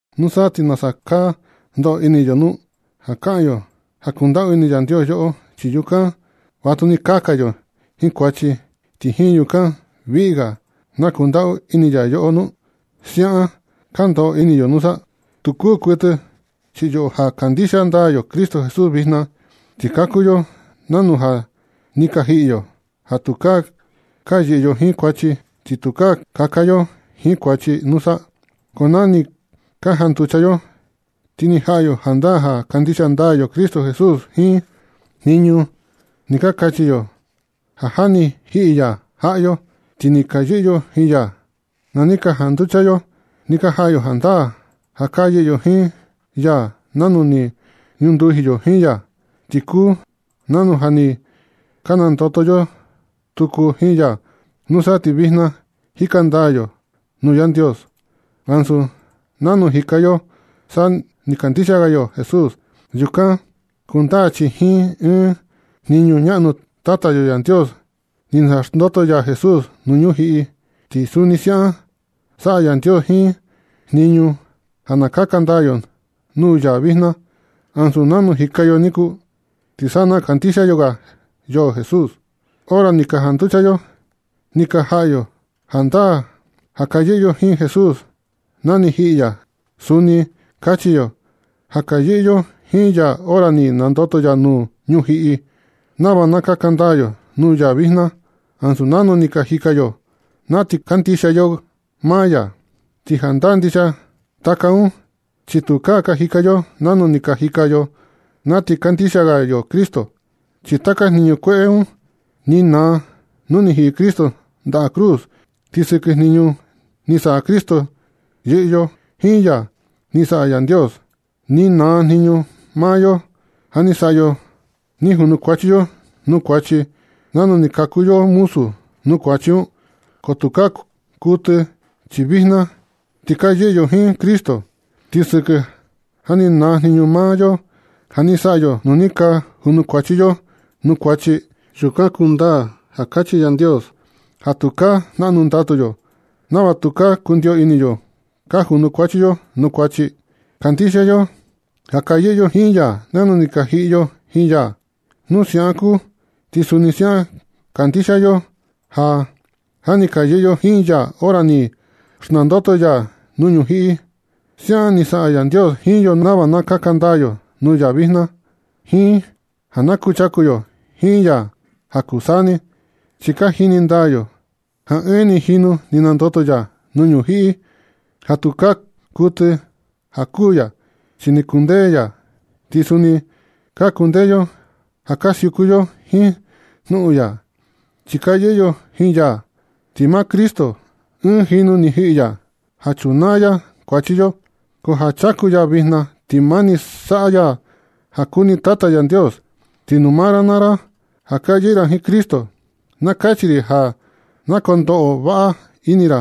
¿Nusa ti nasa ka ndoꞌo ini yo nu? ¿Ka kaꞌan yo ja kundaꞌu ini Yandios yoꞌo, ti yukan vatuni kaka yo jiin kuachi, ti jiin yukan viꞌi ga na kundaꞌu ini ya yoꞌo nu? ¿Siaꞌan ka ndoꞌo ini yo nusa? ¡Tu kuu kuɨtɨ! Chi yoꞌo ja kandixia ndaa yo Cristo Jesús vijna, ka kuu yo nanu ja ni ka jiꞌi yo, ja tukaa ka yɨꞌɨ yo jiin kuachi, ja tukaa kaka yo jiin kuachi, nusa. Ko na ni ka janducha yo ti ni jaꞌa yo jandaa ja kandixia ndaa yo Cristo Jesús. Jiin jniñu un ni ka kachi yo ja ja ni jiꞌi ya jaꞌa yo, ti ni ka yɨꞌɨ yo jiin ya. Na ni ka janducha yo ni ka jaꞌa yo jandaa ja ka yɨꞌɨ yo jiin ya nanu ni ñunduji yo jiin ya. Ti kuu nanu ja ni ka nandoto yo tuku jiin ya. Nusa ti vijna jika ndaa yo nuu Yandios ansu nanu jika yo sa ni kandixia ga yo Jesús. Yukan kundaa chi jiin ɨɨn jniñu ñaꞌnu Tata yo Yandios ni naxndoto ya Jesús nuu ñujiꞌi, ti suni siaꞌan saꞌa Yandios ɨɨn jniñu ja na kaka ndaa yo nuu ya vijna, ansu nanu jika ka yo niku ti sa ni kandixia ga yo Jesús. Hora ni ka janducha yo, ni ka jaꞌa yo jandaa ja ka yɨꞌɨ yo jiin Jesús na ni jiꞌi ya. Suni kachi yo ja ka yɨꞌɨ yo jiin ya hora ni nandoto ya nuu ñujiꞌi, nava na kaka ndaa yo nuu ya vijna, ansu nanu ni ka jika yo na ti kandixia ga yo maa ya. Ti jandaa ndixia taka un chi tukaa ka jika yo nanu ni ka jika yo na ti kandixia ga yo Cristo. Chi taka jniñu kueꞌe un ni naa nu ni jiꞌi Cristo ndaꞌa cruz. Ti sɨkɨ jniñu ni saꞌa Cristo yɨꞌɨ yo jiin ya ni saꞌa Yandios. Ni naa jniñu maa yo ja ni saꞌa yo ni junukuachi yo nuu kuachi, nanu ni ka kuu yo muzu nuu kuachi un. Ko tukaa kuɨtɨ, chi vijna ti ka yɨꞌɨ yo jiin Cristo. Ti sɨkɨ ja ni naa jniñu maa yo ja ni saꞌa yo nu ni ka junukuachi yo nuu kuachi, yukan kundaa ja kachi Yandios ja tukaa jnaꞌnu ndatu yo nava tukaa kundio ini yo ka junukuachi yo nuu kuachi. Kandixia yo ja ka yɨꞌɨ yo jiin ya nanu ni ka jiꞌi yo jiin ya. Nu siaꞌan kuu ti suni siaꞌan kandixia yo ja ja ni ka yɨꞌɨ yo jiin ya hora ni naxndoto ya nuu ñujiꞌi. Siaꞌan ni saꞌa Yandios jiin yo nava na kaka ndaa yo nuu ya vijna, jiin ja na kuchaku yo jiin ya ja kuu saa ni. Chi ka jini ndaa yo ja ɨɨn ni jinu ni nandoto ya nuu ñujiꞌi ja tukaa kuɨtɨ ja kuū ya, chi ni kundee ya. Ti suni ka kundee yo ja ka siuku yo jiin jnuꞌun ya, chi ka yɨꞌɨ yo jiin ya. Ti maa Cristo, ɨɨn jinu ni ni jiꞌi ya ja chunaa ya kuachi yo, ko ja chaku ya vijna ti mani saꞌa ya ja kuni Tata Yandios. Ti nuu maa ra naa ra ja ka yɨꞌɨ ra jiin Cristo, na kachi ri ja na kondoꞌo vaꞌa ini ra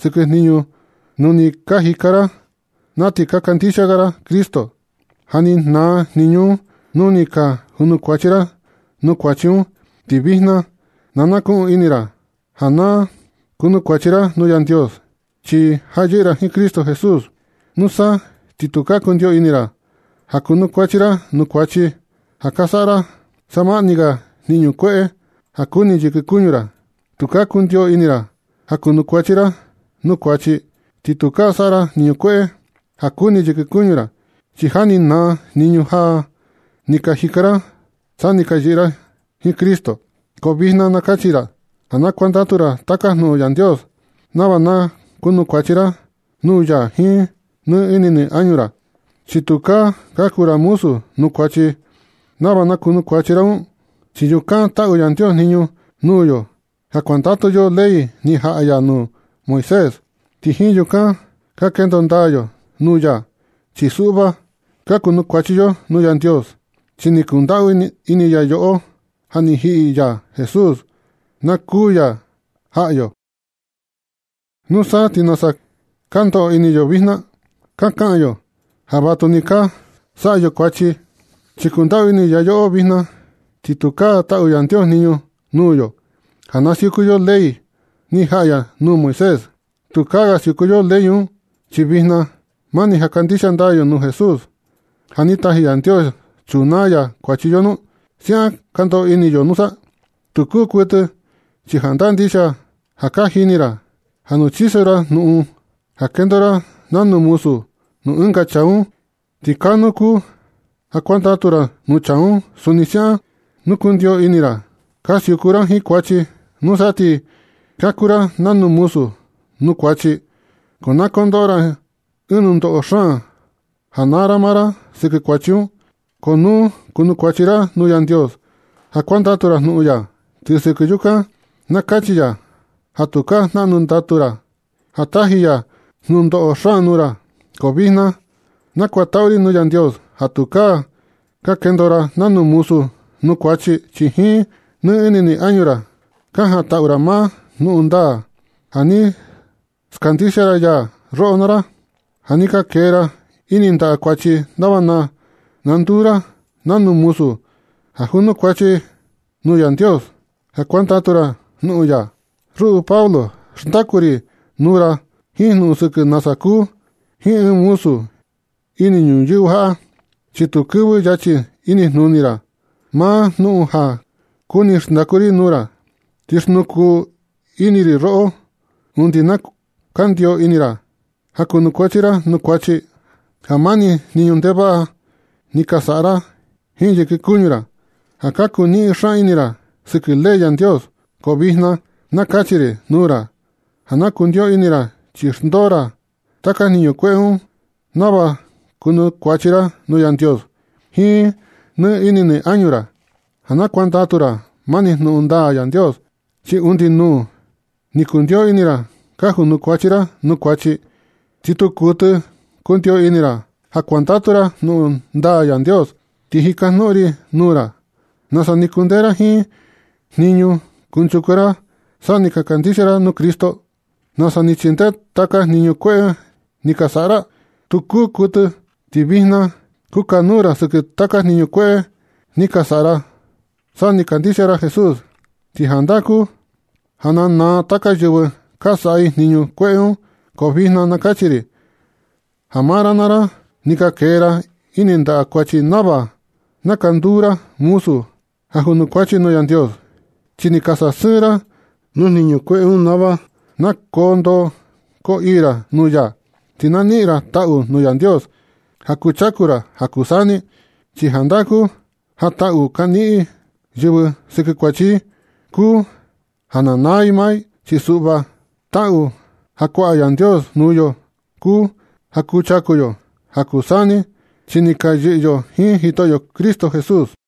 sɨkɨ jniñu nu ni ka jika ra na ti ka kandixia ga ra Cristo, ja ni naa jniꞌnu un nu ni ka junukuachi ra nuu kuachi un. Ti vijna, na nakuꞌun ini ra ja na kunukuachi ra nuu Yandios, chi ja ka yɨꞌɨ ra jiin Cristo Jesús. Nusa ti tukaa kundio ini ra ja kunukuachi ra nuu kuachi, ja ka saꞌa ra savaꞌa ni ga jniñu kueꞌe ja kuni yɨkɨ kuñu ra. Tukaa kundio ini ra ja kunukuachi ra nuu kuachi, ja tukaa saꞌa ra jniñu kueꞌe ja kuni yɨkɨ kuñu ra, chi ja ni naa jniñu ja ni ka jika ra sa ni ka yɨꞌɨ ra jiin Cristo. Ko vijna na kachi ra ja na kuandatu ra taka jnuꞌun Yandios, nava na kunukuachi ra nuu ya jiin nɨ ini nɨ añu ra. Chi tukaa ka kuu ra muzu nuu kuachi nava na kunukuachi ra un, chi tukaa taꞌu Yandios jniñu nuu yo ja kuandatu yo ley ni jaꞌa ya nuu Moisés, ti jiin yukan ka kendo ndaa yo nuu ya. Chi suꞌva, ka kunukuachi yo nuu Yandios, chi ni kundaꞌu ini ya yoꞌo ja ni taji ya Jesús na kuū ya jaꞌa yo. ¿Nusa ti nasa ka ndoꞌo ini yo vijna? ¿Ka kaꞌan yo ja vatuni ka saꞌa yo kuachi chi kundaꞌu ini ya yoꞌo vijna, ja tukaa taꞌu Yandios jniñu nuu yo ja na siuku yo ley ni jaꞌa ya nuu Moisés? ¿Tukaa ga siuku yo ley un, chi vijna mani ja kandixia ndaa yo nuu Jesús ja ni taji Yandios chunaa ya kuachi yo nu? ¿Siaꞌan ka ndoꞌo ini yo nusa? ¡Tu kuu kuɨtɨ! Chi jandaa ndixia ja ka jini ra, ja nu chiso ra jnuꞌun ja ka kendo ra nanu muzu nuu ɨnga chaa un, ti kaa nuu kuu ja kuandatu ra nuu chaa un. Suni siaꞌan, nu kundio ini ra ka siuku ra jiin kuachi, nusa ti ka kuu ra nanu muzu nuu kuachi. Ko na kondoꞌo ra ɨɨn nundoꞌo xaan ja naa ra maa ra sɨkɨ kuachi un. Ko nu kunukuachi ra nuu Yandios ja kuandatu ra jnuꞌun ya, ti sɨkɨ yukan na kachi ya ja tukaa jnaꞌnu ndatu ra ja taji ya nunoꞌo xaan nuu ra. Ko vijna nakutaꞌu ri nuu Yandios ja tukaa ka kendo ra nanu muzu nuu kuachi, chi jiin nɨ ini nɨ añu ra ka jantaꞌu ra maa jnuꞌun ndaa ja ni skandixia ya roꞌo naa ra. Ja ni ka kee ra ini ndaꞌa kuachi nava na nduu ra nanu muzu ja junukuachi ra nuu Yandios, ja kuandatu ra jnuꞌun ya. Ruꞌu Pablo, xndaku ri nuu ra jiin jnuꞌun sɨkɨ nasa kuu jiin ɨɨn muzu ini ñuyɨvɨ jaꞌa, chi tu kɨvɨ yachi inijnuni ra maa jnuꞌun ja kuni xndaku ri nuu ra. Ti xnukuu ini ri roꞌo undi na kandio ini ra ja kunukuachi ra nuu kuachi, ja mani jniñu ndevaꞌa ni ka saꞌa ra jiin yɨkɨ kuñu ra, ja ka kuniꞌin xaan ini ra sɨkɨ ley Yandios. Ko vijna na kachi ri nuu ra ja na kundio ini ra chi xndoo ra taka jniñu kueꞌe un nava kunukuachi ra nuu Yandios jiin nɨ ini nɨ añu ra, ja na kuandatu ra mani jnuꞌun ndaa Yandios. Chi undi nuu ni kundio ini ra ka junukuachi ra nuu kuachi, ti tu kuɨtɨ kundio ini ra ja kuandatu ra jnuꞌun ndaa Yandios. Ti jikajnuꞌun ri nuu ra, ¿nasa ni kundee ra jiin jniñu kunchuku ra sa ni kandixia ra nuu Cristo? ¿Nasa ni chindee taka jniñu kueꞌe ni ka saꞌa ra? ¡Tu kuu kuɨtɨ! Ti vijna kukanuu ra sɨkɨ taka jniñu kueꞌe ni ka saꞌa ra sa ni kandixia ra Jesús. Ti jandaa kuu ja na naa taka yɨvɨ ka saꞌa i jniñu kueꞌe un. Ko vijna na kachi ri ja maa ra naa ra ni ka kee ra ini ndaꞌa kuachi nava na ka nduu ra muzu ja junukuachi nuu Yandios. Chi ni ka sasɨɨn ra nuu jniñu kueꞌe un nava na koo ndoo koo ii ra nuu ya. Ti na niꞌin ra taꞌu nuu Yandios ja kuchaku ra ja kuu saa ni. Chi jandaa kuu ja taꞌu ka niꞌin yɨvɨ sɨkɨ kuachi i kuu ja na naa i maa i. Chi suꞌva, taꞌu ja kuaꞌa Yandios nuu yo kuu ja kuchaku yo ja kuu saa ni, chi ni ka yɨꞌɨ yo jiin Jitoꞌyo Cristo Jesús.